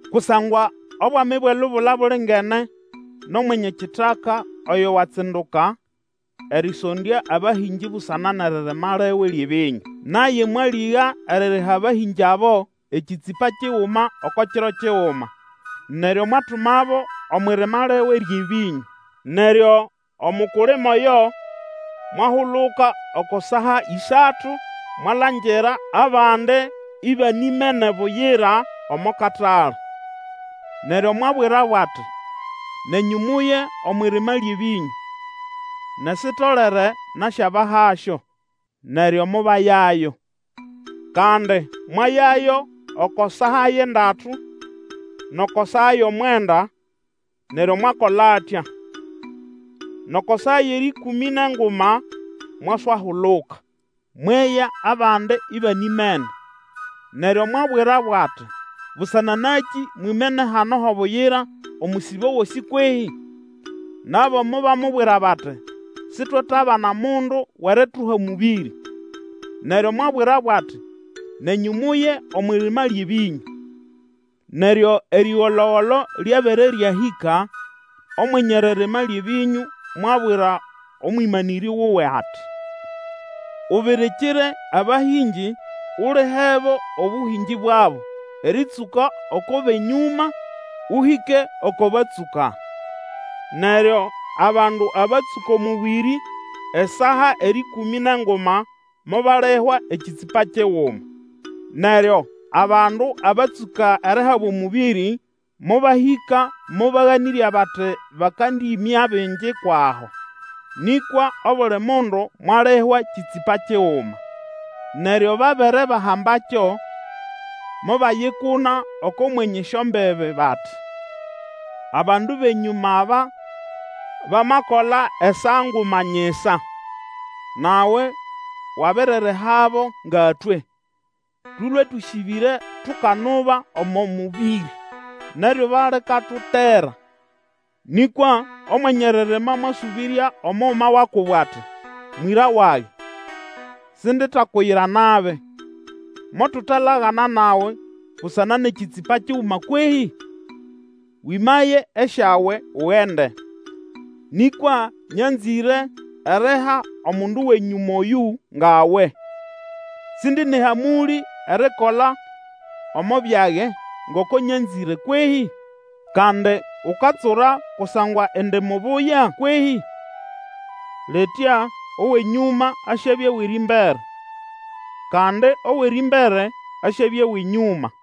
Kusangwa obwami bwʼelubula bulingene nʼomwenye kitaka oyo watsinduka erĩsondya abahĩngĩ busana nʼeririma liwe lyʼebĩnyũ. Naye mwalĩga eririha abahĩngĩ abo ekĩtsĩpa kiguma oko kiro kiguma, neryo mwatumabo omwʼirima liwe lyʼebĩnyũ. Neryo omukulima oyo mwahuluka oko saa ĩsatu mwalangira abandi ibanimene buyira omo katale. Neryo mwabwirabo ati, Nenyũ muye omwʼirima lyʼebĩnyũ, nʼesitolere nasyabahasyo. Neryo mobayayo. Kandi mwayayo oko saa yʼendatu, nʼoko saa yʼomwenda, neryo mwakola atya. Nʼoko saa yʼerĩkũmĩ nʼenguma mwaswahuluka, mweya abandi ibanimene. Neryo mwabwirabo ati, Busana nakĩ mwimene hano ho buyira omusibo gosĩ kwehĩ? Nabo mobamubwira bati, Sitwetabana mundu wʼerituha mũbĩrĩ. Neryo mwabwirabo ati, Nenyũ muye omwʼirima lyʼebĩnyũ. Neryo erĩgolo-golo lyabere ryahĩka, Omwenye eririma lyʼebĩnyũ mwabwira omwĩmanĩrĩ wuwe ati, Ubirikire abahĩngĩ Ulihebo obũhĩngĩ bwabo erĩtsũka oko bʼenyũma ũhĩke oko batsũka. Neryo abandu abatsũka omũbĩrĩ esaa erĩkũmĩ nʼenguma mobalihwa ekĩtsĩpa kiguma. Neryo abandu abatsũka erihabwa omũbĩrĩ mobahĩka mobaganĩrya bati bakandĩĩmya bingi kwʼaho; nĩkwa obuli mundu mwalihwa kĩtsĩpa kiguma. Neryo babere bahambakyo, mobayikuna oko mwenye esyombibi, bati, Abandu bʼenyũma aba bamakola esaa nguma nyisa, nawe wabiririhabo ngatwe, tũlũe tũsĩbĩre tukanuba omo mũbĩrĩ, nʼeryuba likatutera. Nĩkwa Omwenye eririma mwasũbĩrya omuguma wa kubo ati, Mwĩra wage, sinditakuyira nabi, motutalagana nawe busana nʼekĩtsĩpa kiguma kwehĩ? Wĩmaye esyawe, ugende. Nĩkwa nyanzĩre eriha omundu wʼenyũma oyũ ngawe. Sindi nʼehamũlĩ erikola omo byage ngoko nyanzĩre kwehĩ? Kandi ukatsura kusangwa indi mubuya kwehĩ? Litya owʼenyũma asyabya wʼerĩmbere, kandi owʼerĩmbere asyabya wʼenyũma.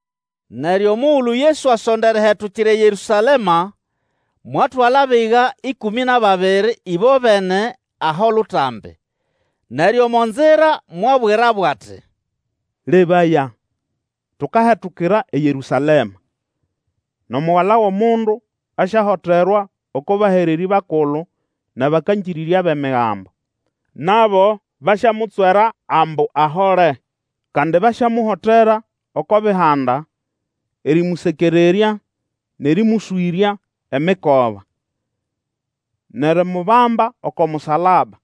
Neryo omugulu Yesu asonda erihetukira eYerũsalema, mwatwala abiga ĩkũmĩ nʼababiri ĩbobene aho lutambi, neryo omo nzira mwabwirabo ati, Lebaya, tukahetukira eYerũsalema, nʼomugala wʼomundu asyahoterwa oko bahererĩ bakulu nʼabakangĩrĩrya bʼEmigambo, nabo basyamutswera ambu ahole. Kandi basyamuhotera oko Bihanda erĩmũsekererya nʼerĩmũswĩrya emikoba, nʼerimubamba oko musalaba,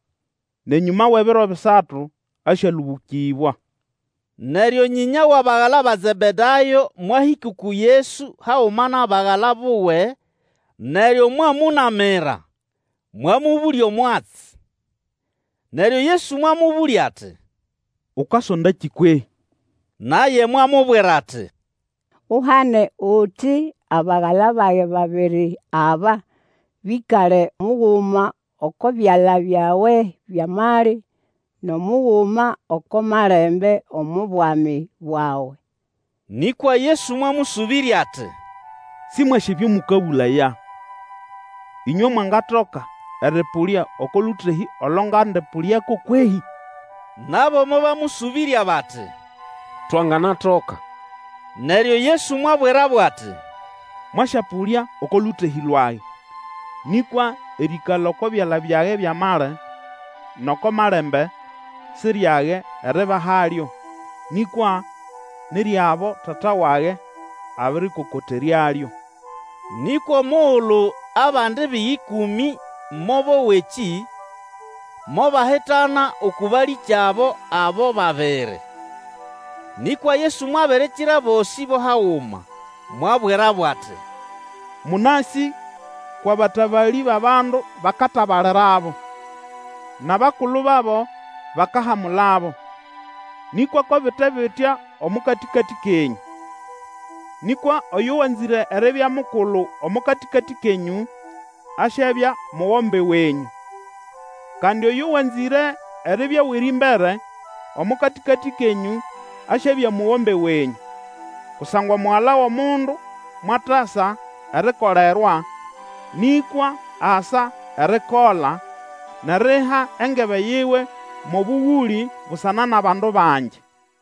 nʼenyũma wʼebiro bisatu asyalũbũkĩbwa. Neryo nyĩnya wʼabagala ba Zebedayo mwahĩka uku Yesu haguma nʼabagala buwe, neryo mwamũnamira, mwamũbũlya omwatsi. Neryo Yesu mwamũbũlya ati, Ukasondakĩ kwehĩ? Naye mwamubwira ati, Uhane, uti abagala bage babiri aba, bĩkale muguma oko byala byawe byʼamali, nʼomuguma oko malembe omo Bwami bwawe. Nĩkwa Yesu mwamũsũbĩrya ati, Sĩmwasĩ ebyo mũkabũlaya. Ĩnywe mwangatoka erĩpũlya oko lũtehĩ olo ngandĩpũlyako kwehĩ? Nabo mobamũsũbĩrya bati, Twanganatoka. Neryo Yesu mwabwirabo ati, Mwasyapũlya oko lũtehĩ lwage, nĩkwa erĩĩkala oko byala byage byʼamali, nʼoko malembe, si ryage eribahalyo, nĩkwa ni ryʼabo Tata wage abĩrĩkokoteryalyo. Nĩkwa omugulu abandi biga ĩkũmĩ mobowa ekĩ, mobahitana uku balĩkyabo abo babiri. Nĩkwa Yesu mwabirikira abosĩ bo haguma, mwabwirabo ati, Mũnasĩ kwʼabatabalĩ bʼabandu bakatabalirabo, nʼabakulu babo bakahamulabo. Nĩkwa ko bite bitya omo katĩkatĩ kenyũ. Nĩkwa oyo wanzĩre eribya mukulu omo katĩkatĩ kenyũ, asyabya mugombe wenyũ, kandi oyo wanzĩre eribya wʼerĩmbere omo katĩkatĩ kenyũ asyabya mugombe wenyũ. Kusangwa Omugala wʼomundu mwatasa erikolerwa, nĩkwa asa erikola, nʼeriha engebe yiwe mo bũgũlĩ busana nʼabandu bangi.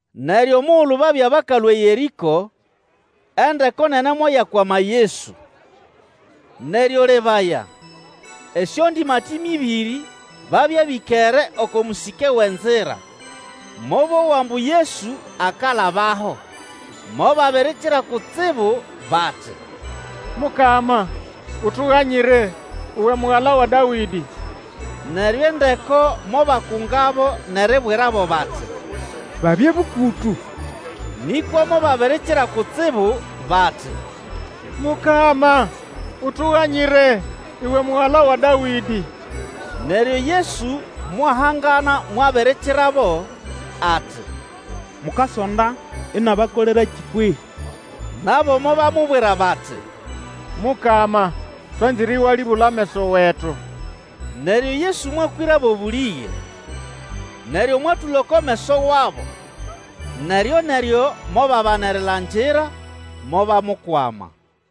Neryo omugulu babya bakalũa eYerĩko, endeko nene moyakwama Yesu. Neryo lebaya, esyondĩmatĩme ĩbĩrĩ babya bĩkere oko mũsĩke wʼenzira mobowa ambu Yesu akalabaho, mobabirikira kutsibu bati, Mukama, utuganyire, uwe Mugala wa Dawĩdĩ. Neryo endeko mobakungabo nʼeribwirabo bati, babye bũkũtũ. Nĩkwa mobabirikira kutsibu bati, Mukama, utuganyire, uwe Mugala wa Dawĩdĩ! Neryo Yesu mwahangana mwabirikirabo, ati, Mukasonda inabakolerakĩ kwehĩ? Nabo mobamubwira bati, Mukama, twanzĩre ĩwalĩbũla ameso wetu. Neryo Yesu mwakwĩrabo bũlĩge, neryo mwatũla oko meso wabo; neryoneryo mobabana erilangira, mobamukwama.